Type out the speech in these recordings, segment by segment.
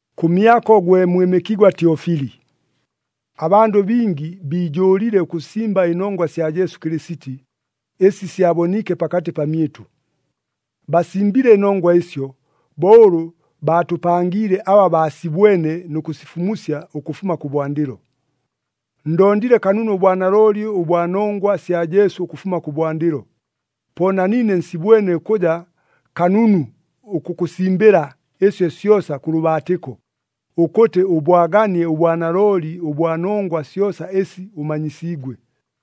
Kʉmyako gwe mwɨmɨkigwa Tyofili: Abandʉ bingi biijʉʉlile ʉkʉsimba ɨnongwa sya Jesu Kɨlɨsiti, ɨsi syaboniike pakatɨ pamyɨtʉ. Basimbile ɨnongwa ɨsyo, bo ʉlʉ baatʉpangiile aba baasibwene nʉ kʉsifumusya ʉkʉfuma kʉbwandɨlo. Ndondile kanunu ʉbwanalooli ʉbwa nongwa sya Jesu ʉkʉfuma kʉbwandɨlo, po na niine nsibwene ʉkʉja kanunu ʉkʉkʉsimbɨla ɨsyo syosa kʉ lʉbaatɨko, ʉkʉtɨ ʉbwaganie ʉbwanalooli ʉbwa nongwa syosa ɨsi ʉmanyisiigwe.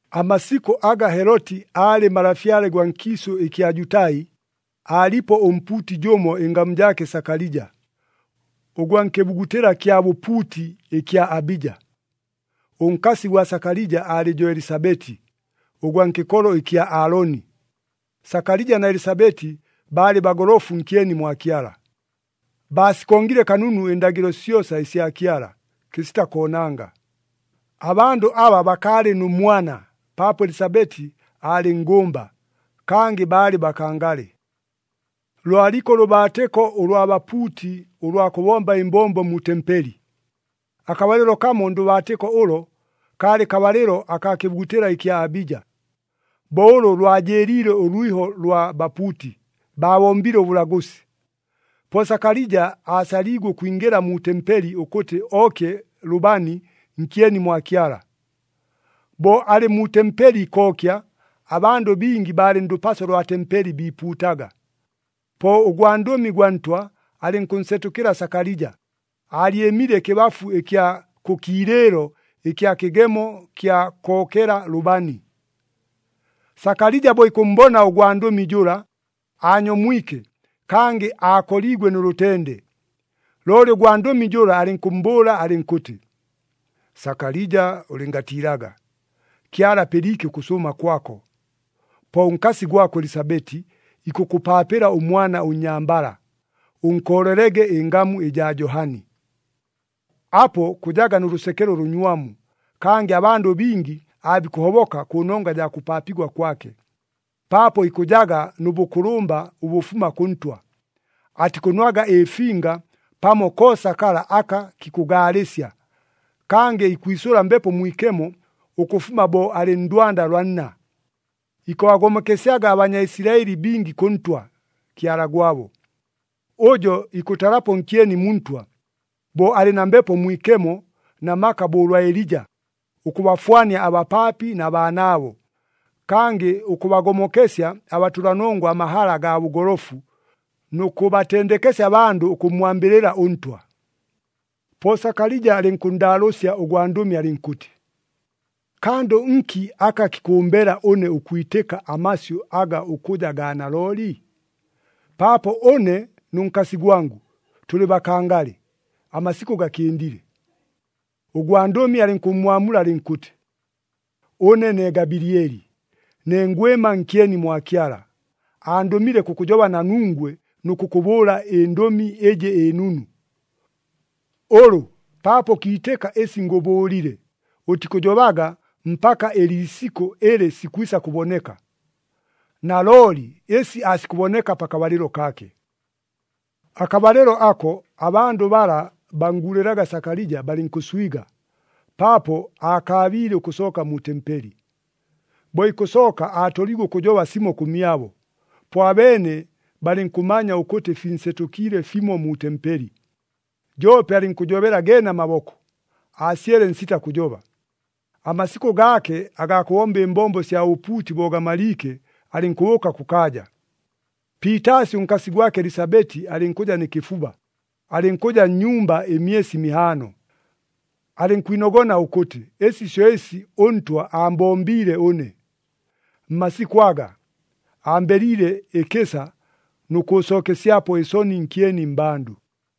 Amasikʉ aga Heloti aalɨ malafyale gwa nkiisʉ ɨkya Jutai, aalipo ʉmpuuti jʉmo ɨngamu jaake Sakalija, ʉgwa nkɨbugutɨla kya bʉpuuti ɨkya Abija. Ʉnkasi gwa Sakalija aalɨ jo Elisabeti, ʉgwa nkɨkolo ɨkya Aaloni. Sakalija na Elisabeti baalɨ bagolofu nkyeni mwa Kyala, baasikongile kanunu ɨndagɨlo syosa ɨsya Kyala, kɨsita koonanga. Abandʉ aba bakaalɨ nʉ mwana, paapo Elisabeti aalɨ nngʉmba, kangɨ baalɨ bakangale. Lwaliko ʉlʉbaatɨko ʉlwa bapuuti ʉlwa kʉbomba ɨmbombo mu tempeli. Akabalɨlo kamo ndʉbaatɨko ʉlo, kaalɨ kabalɨlo akaa kɨbugutɨla ɨkya Abija. Bo ʉlʉ lwajɨɨliile ʉlwiho ʉlwa bapuuti, baabombile ʉbʉlagʉsi. Po Sakalija aasaliigwe ʉkwingɨla mu tempeli ʉkʉtɨ ookye lʉbani nkyeni mwa Kyala. Bo alɨ mu tempeli ikookya, abandʉ bingi baalɨ ndʉpaso lwa tempeli biipuutaga. Po ʉgwandʉmi gwa Ntwa alɨnkʉnsetʉkɨla Sakalija, aalyɨmile ɨkɨbafu ɨkya kʉ kiilɨɨlo ɨkya kɨgemo kya kookela lʉbani. Sakalija bo ikʉmmbona ʉgwandʉmi jʉla, aanyomwike, kangɨ aakoliigwe nʉ lʉtende. Looli ʉgwandʉmi jʉla alɨnkʉmmbʉʉla alɨnkʉtɨ, “Sakalija, ʉlɨngatiilaga! Kyala apɨliike ʉkʉsʉʉma kwako, po ʉnkasi gwako Elisabeti ikʉkʉpaapɨla ʉmwana ʉnnyambala, ʉnkoolelege ɨngamu ɨjaa Johani. Apo kʉjaga nʉ lʉsekelo ʉlʉnywamu, kangɨ abandʉ bingi aabikʉhoboka kʉnongwa jaa kʉpaapigwa kwake, paapo ikʉjaga nʉ bʉkʉlʉmba ʉbʉfuma kʉ Ntwa. Atikʉnwaga ɨfinga pamo koosa kala aka kikʉgaalɨsya, kangɨ ikwisʉla Mbepo Mwikemo ʉkʉfuma bo alɨ ndwanda lwa nna. Ikʉbagomokesyaga aBanyaisilaɨli bingi kʉ Ntwa, Kyala gwabo. Ʉjo ikʉtalapo nkyeni mu Ntwa, bo alɨ na Mbepo Mwikemo na maka bo ʉlwa Elija, ʉkʉbafwania abapaapi na baanaabo, kangɨ ʉkʉbagomokesya abatʉlanongwa amahala agaa bʉgolofu, nʉ kʉbatendekesya abandʉ ʉkʉmmwambɨlɨla ʉNtwa.” Po Sakalija alɨnkʉnndaalʉʉsya ʉgwandʉmi alɨnkʉtɨ, “Kandʉ nki aka kikʉmbela ʉne ʉkwitɨka amasyʉ aga ʉkʉja gaa nalooli? Paapo ʉne nʉ nkasi gwangʉ tʉlɨ bakangale, amasikʉ gakɨndile.” Ʉgwandʉmi alɨnkʉmmwamula alɨnkʉtɨ, “Ʉne ne Gabilieli, ne ngwɨma nkyeni mwa Kyala, andʉmile kʉkʉjoba na nungwe nʉ kʉkʉbʉʉla ɨndʉmi ɨjɨ ɨnunu. Ʉlʉ, paapo ʉkiitɨka ɨsi ngʉbʉʉlile, ʉtikʉjobaga mpaka ɨliisikʉ ɨlɨ sikwisa kʉboneka. Nalooli ɨsi aasikʉboneka pakabalɨlo kaake.” Akabalɨlo ako, abandʉ bala bannguulɨlaga Sakalija balɨnkʉnswiga, paapo aakaabiile ʉkʉsooka mu tempeli. Bo ikʉsooka aatoliigwe ʉkʉjoba simo kʉmyabo, po abeene balɨnkʉmanya ʉkʉtɨ, finsetʉkiile fimo mu tempeli. Joope alɨnkʉjobela geene amaboko, aasyele nsita kʉjoba. Amasikʉ gaake agaa kʉbomba ɨmbombo sya bʉpuuti bo gamaliike, alɨnkʉbʉʉka kʉkaaja. Piitaasi ʉnkasi gwake Elisabeti alɨnkʉja nɨ kɨfuba, alɨnkʉja nnyumba ɨmyesi mihaano. Alɨnkwinogona ʉkʉtɨ, “Ɨsi syo ɨsi ʉNtwa aambombiile ʉne. Mmasikʉ aga, ambeliile ɨkɨsa nʉ kʉʉsookesyapo ɨsoni nkyeni mmbandʉ.”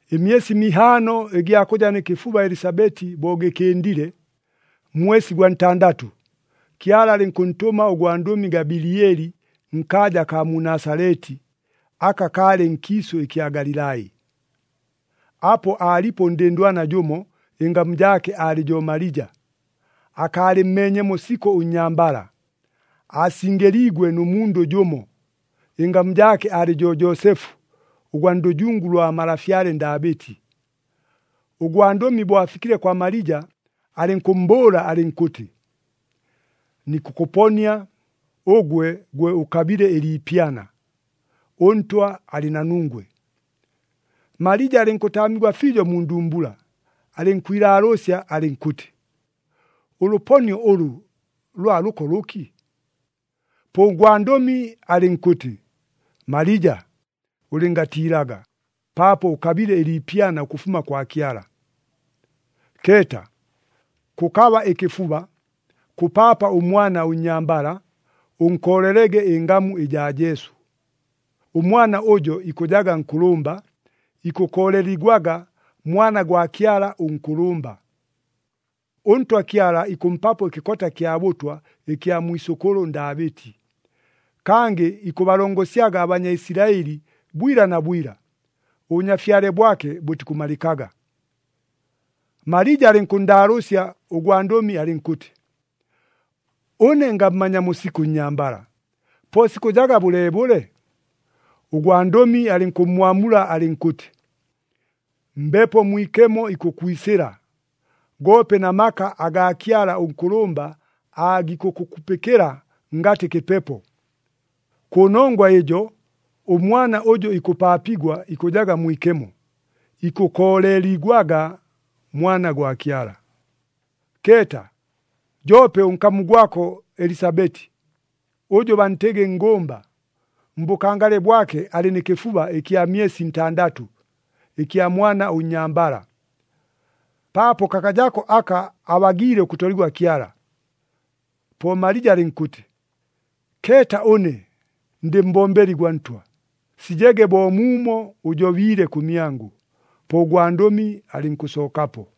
Ɨmyesi mihaano ɨgya kʉja nɨ kɨfuba Elisabeti bo gɨkɨndile, mmwesi gwa ntandatʉ, Kyala alɨnkʉntʉma ʉgwandʉmi Gabilieli nkaaja akaa mu Nasaleti, aka kaalɨ nkiisʉ ɨkya Galilai. Apo aalipo ʉndɨndwana jʉmo, ɨngamu jaake aalɨ jo Malija. Akaalɨmmeenyemo sikʉ ʉnnyambala, aasingɨliigwe nʉ mundʉ jʉmo, ɨngamu jaake alɨ jo Joosefu, ʉgwa ndʉjungu lwa malafyale Ndaabɨti. Ʉgwandʉmi bo afikile kwa Malija alɨnkʉmmbʉʉla alɨnkʉtɨ, “Nikʉkʉponia, ʉgwe gwe ʉkabile ɨliipyana! ɄNtwa alɨ na nungwe!” Malija alɨnkʉtaamigwa fiijo mu ndumbula, alɨnkwilaalʉʉsya alɨnkʉtɨ, “Ʉlʉponio ʉlʉ, lwa lʉko lʉki?” Po ʉgwandʉmi alɨnkʉtɨ, “Malija, ʉlɨngatiilaga, paapo ʉkabile ɨliipyana ʉkʉfuma kwa Kyala. Keeta, kʉkaba ɨkɨfuba, kʉpaapa ʉmwana ʉnnyambala, ʉnkoolelege ɨngamu ɨjaa Jesu. Ʉmwana ʉjo ikʉjaga nkʉlʉmba, ikʉkooleligwaga Mwana gwa Kyala ʉNkʉlʉmba. ɄNtwa Kyala ikʉmpapo ɨkɨkota kya bʉtwa ɨkya mwisʉkʉlʉ Ndaabɨti. Kangɨ ikʉbalongosyaga aBanyaisilaɨli bwila na bwila, ʉBʉnyafyale bwake bʉtikʉmalɨkaga.” Malija alɨnkʉnndaalʉʉsya ʉgwandʉmi alɨnkʉtɨ, “Ʉne ngammanyamo sikʉ ʉnnyambala, po ɨsi sikʉjaga bʉleebʉle?” Ʉgwandʉmi alɨnkʉmmwamula alɨnkʉtɨ, “Mbepo Mwikemo ikʉkwisɨla, goope na maka agaa Kyala ʉNkʉlʉmba aagikʉkʉkupɨkɨla ngatɨ kɨpepo. Kʉnongwa ɨjo ʉmwana ʉjʉ ikʉpaapigwa ikʉjaga mwikemo, ikʉkooleligwaga Mwana gwa Kyala. Keeta! Joope ʉnkamu gwako Elisabeti, ʉjʉ bantɨgɨ nngʉmba, mbʉkangale bwake alɨ nɨ kɨfuba ɨkya myesi ntandatʉ, ɨkya mwana ʉnnyambala. Paapo kakajako aka abagiile ʉkʉtoligwa Kyala.” Po Malija alɨnkʉtɨ, “Keeta ʉne, ndɨ mbombeli gwa Ntwa! Sijege bo muumo ʉjobiile kʉmyangʉ.” Po ʉgwandʉmi alɨnkʉsookapo.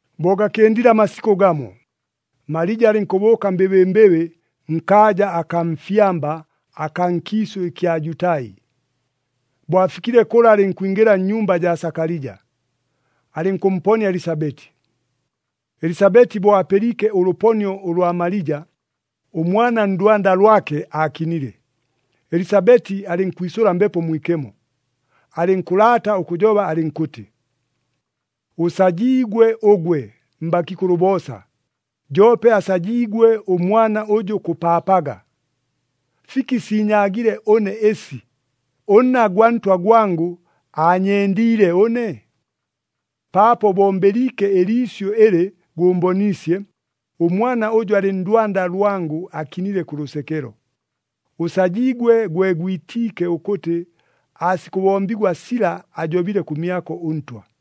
Bo gakɨndile amasikʉ gamo, Malija alɨnkʉbʉʉka mbɨbɨmbɨbɨ nkaaja akaa mfyamba akaa nkiisʉ ɨkya Jutai. Bo afikile kʉla alɨnkwingɨla nnyumba jaa Sakalija, alɨnkʉmponia Elisabeti. Elisabeti bo apɨliike ʉlʉponio ʉlwa Malija, ʉmwana ndwanda lwake aakinile. Elisabeti alɨnkwisʉla Mbepo Mwikemo, alɨnkʉlaata ʉkʉjoba alɨnkʉtɨ, “Ʉsajiigwe ʉgwe mbakiikʉlʉ boosa, joope asajiigwe ʉmwana ʉjʉ kʉpaapaga! Fiki siinyaagile ʉne ɨsi, ʉnna gwa Ntwa gwangʉ aanyendiile ʉne? Paapo bo mbɨliike ɨliisyʉ ɨlɨ gʉmboniisye, ʉmwana ʉjʉ alɨ ndwanda lwangʉ akinile kʉ lʉsekelo. Ʉsajiigwe gwe gwitiike ʉkʉtɨ aasikʉbombigwa sila ajobile kʉmyako ʉNtwa.”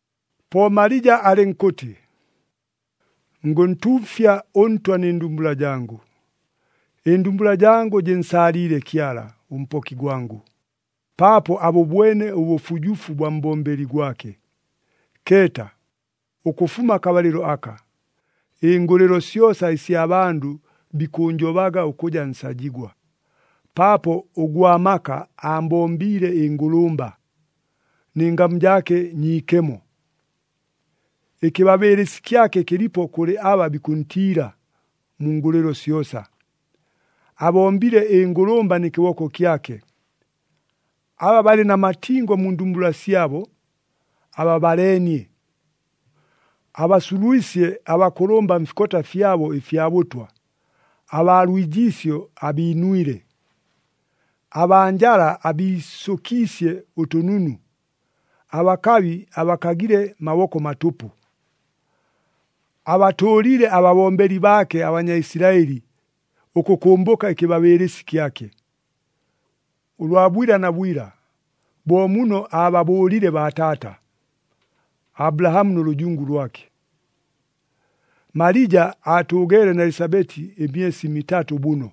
Po Malija alɨnkʉtɨ, “Ngʉntuufya ʉNtwa nɨ ndumbula jangʉ, ɨndumbula jangʉ jɨnsaaliile Kyala, ʉMpoki gwangʉ, paapo abʉbwene ʉbʉfujufu bwa mbombeli gwake. Keeta, ʉkʉfuma akabalɨlo aka, ɨngʉlɨlo syosa ɨsya bandʉ bikʉʉnjobaga ʉkʉja nsajigwa, paapo ʉGwa maka aambombiile ɨngʉlʉmba, nɨ ngamu jaake nyiikemo. Ɨkɨbabɨɨlɨsi kyake kɨlipo kʉlɨ aba bikʉntiila, mu ngʉlɨlo syosa. Abombile ɨngʉlʉmba nɨ kɨboko kyake, aba balɨ na matingo mu ndumbula syabo, ababaleenie. Abasulwisye abakʉlʉmba mfikota fyabo ɨfya bʉtwa, abaa lwijiisyo abiinwile. Abaa njala abiisʉkiisye ʉtʉnunu, abakabi abakagile maboko matʉpʉ. Abatʉʉlile ababombeli baake aBanyaisilaɨli, ʉkʉkʉmbʉka ɨkɨbabɨɨlɨsi kyake, ʉlwa bwila na bwila, bo muno aababʉʉlile baataata, Abulahamu nʉ lʉjungu lwake.” Malija aatʉʉgeele na Elisabeti ɨmyesi mitatʉ bʉno,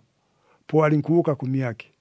po alɨnkʉbʉʉka kʉmyake.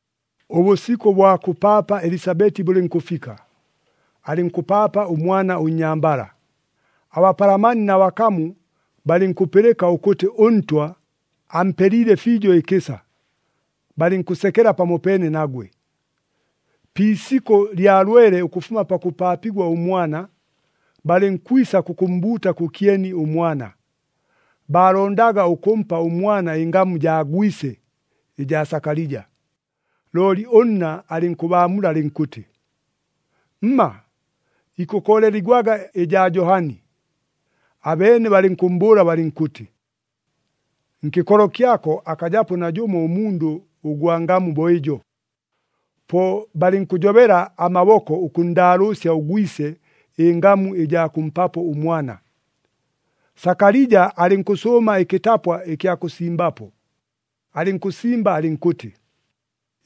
Ʉbʉsikʉ bwa kʉpaapa Elisabeti bʉlɨnkʉfika, alɨnkʉpaapa ʉmwana ʉnnyambala. Abapalamani na bakamu balɨnkʉpɨlɨka ʉkʉtɨ ʉNtwa ampeliile fiijo ɨkɨsa, balɨnkʉsekela pamopeene nagwe. Pi isikʉ lya lwele ʉkʉfuma pakʉpaapigwa ʉmwana, balɨnkwisa kʉkʉmmbuuta kʉkyeni ʉmwana. Baalondaga ʉkʉmpa ʉmwana ɨngamu jaa gwise, ɨjaa Sakalija. Looli ʉnna alɨnkʉbaamula alɨnkʉtɨ, “Mma, ikʉkooleligwaga ɨjaa Johani.” Abeene balɨnkʉmmbʉʉla balɨnkʉtɨ, “Nkɨkolo kyako akajapo najʉmo ʉmundʉ ʉgwa ngamu bo ɨjo.” Po balɨnkʉjobela amaboko ʉkʉnndaalʉʉsya ʉgwise ɨngamu ɨjaa kʉmpapo ʉmwana. Sakalija alɨnkʉsʉʉma ɨkɨtapwa ɨkya kʉsimbapo, alɨnkʉsimba alɨnkʉtɨ,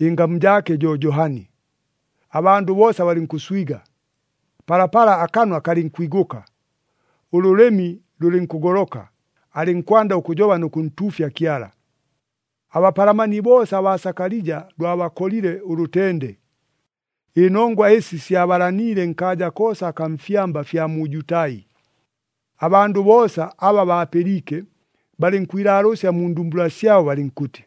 “Ɨngamu jaake jo Johani.” Abandʉ boosa balɨnkʉswiga. Palapala akanwa kalɨnkwigʉka, ʉlʉlɨmi lʉlɨnkʉgoloka, alɨnkwanda ʉkʉjoba nʉ kʉntuufya Kyala. Abapalamani boosa abaa Sakalija lwabakolile ʉlʉtende. Ɨnongwa ɨsi syabalaniile nkaaja koosa akaa mfyamba fya mu Jutai. Abandʉ boosa aba baapɨliike, balɨnkwilaalʉʉsya mu ndumbula syabo balɨnkʉtɨ,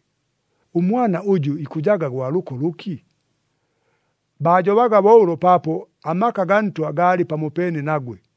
“Ʉmwana ʉjʉ ikʉjaga gwa lʉko lʉki?” Baajobaga bo ʉlo paapo amaka gaa Ntwa gaalɨ pamopeene nagwe.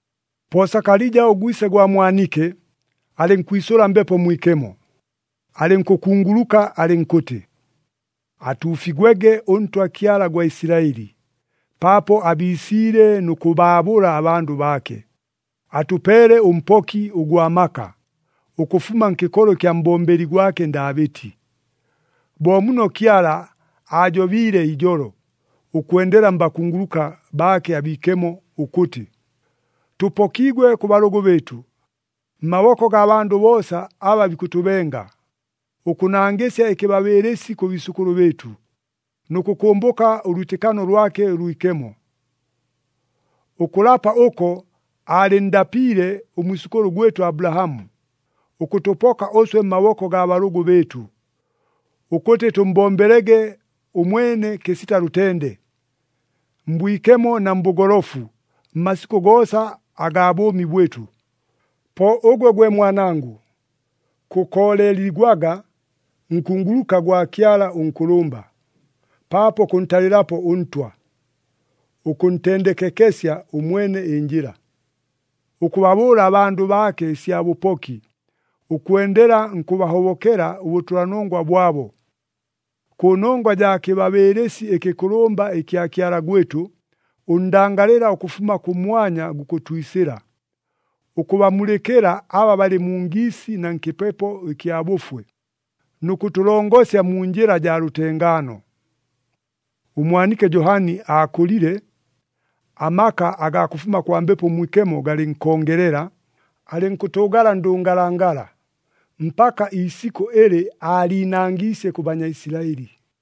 Po Sakalija ʉgwise gwa mwanike, alɨnkwisʉla Mbepo Mwikemo, alɨnkʉkunguluka alɨnkʉtɨ, “Atuufigwege ʉNtwa Kyala gwa Isilaɨli, paapo abiisiile nʉ kʉbaabʉla abandʉ baake. Atʉpeele ʉMpoki ʉgwa maka, ʉkʉfuma nkɨkolo ɨkya mbombeli gwake Ndaabɨti. Bo muno Kyala aajobiile ijolo, ʉkwendela mbakunguluka baake abiikemo ʉkʉtɨ, tʉpokigwe kʉ balʉgʉ bɨɨtʉ, mmaboko gaa bandʉ boosa aba bikʉtʉbenga, ʉkʉnangɨsya ɨkɨbabɨɨlɨsi kʉ biisʉkʉlʉ bɨɨtʉ, nʉ kʉkʉmbʉka ʉlwitɨkano lwake ʉlwikemo. Ʉkʉlapa ʉko aalɨnndapiile ʉmwisʉkʉlʉ gwɨtʉ Abulahamu, ʉkʉtʉpoka ʉswe mmaboko gaa balʉgʉ bɨɨtʉ, ʉkʉtɨ tʉmmbombelege ʉmwene kɨsita lʉtende, mbwikemo na mbʉgolofu, mmasikʉ goosa agaa bʉʉmi bwɨtʉ. Po ʉgwe gwe mwanangʉ, kʉkooleligwaga nkunguluka gwa Kyala ʉNkʉlʉmba, paapo kʉntalɨlapo ʉNtwa ʉkʉntendekekesya ʉmwene ɨnjɨla, ʉkʉbabʉʉla abandʉ baake ɨsya bʉpoki, ʉkwendela nkʉbahobokela ʉbʉtʉlanongwa bwabo. Kʉnongwa jaa kɨbabɨɨlɨsi ɨkɨkʉlʉmba ɨkya Kyala gwɨtʉ, ʉndangalɨla ʉkʉfuma kʉmwanya gukʉtwisɨla, ʉkʉbamulɨkɨla aba balɨ mu ngiisi na nkɨpepo ɨkya bʉfwe, nʉ kʉtʉlongosya mu njɨla jaa lʉtengaano.” Ʉmwanike Johani aakʉlile, amaka agaa kʉfuma kwa Mbepo Mwikemo galɨnkongelela. Alɨnkʉtʉʉgala ndʉngalangala, mpaka iisikʉ ɨlɨ aaliinangiisye kʉ Banyaisilaɨli.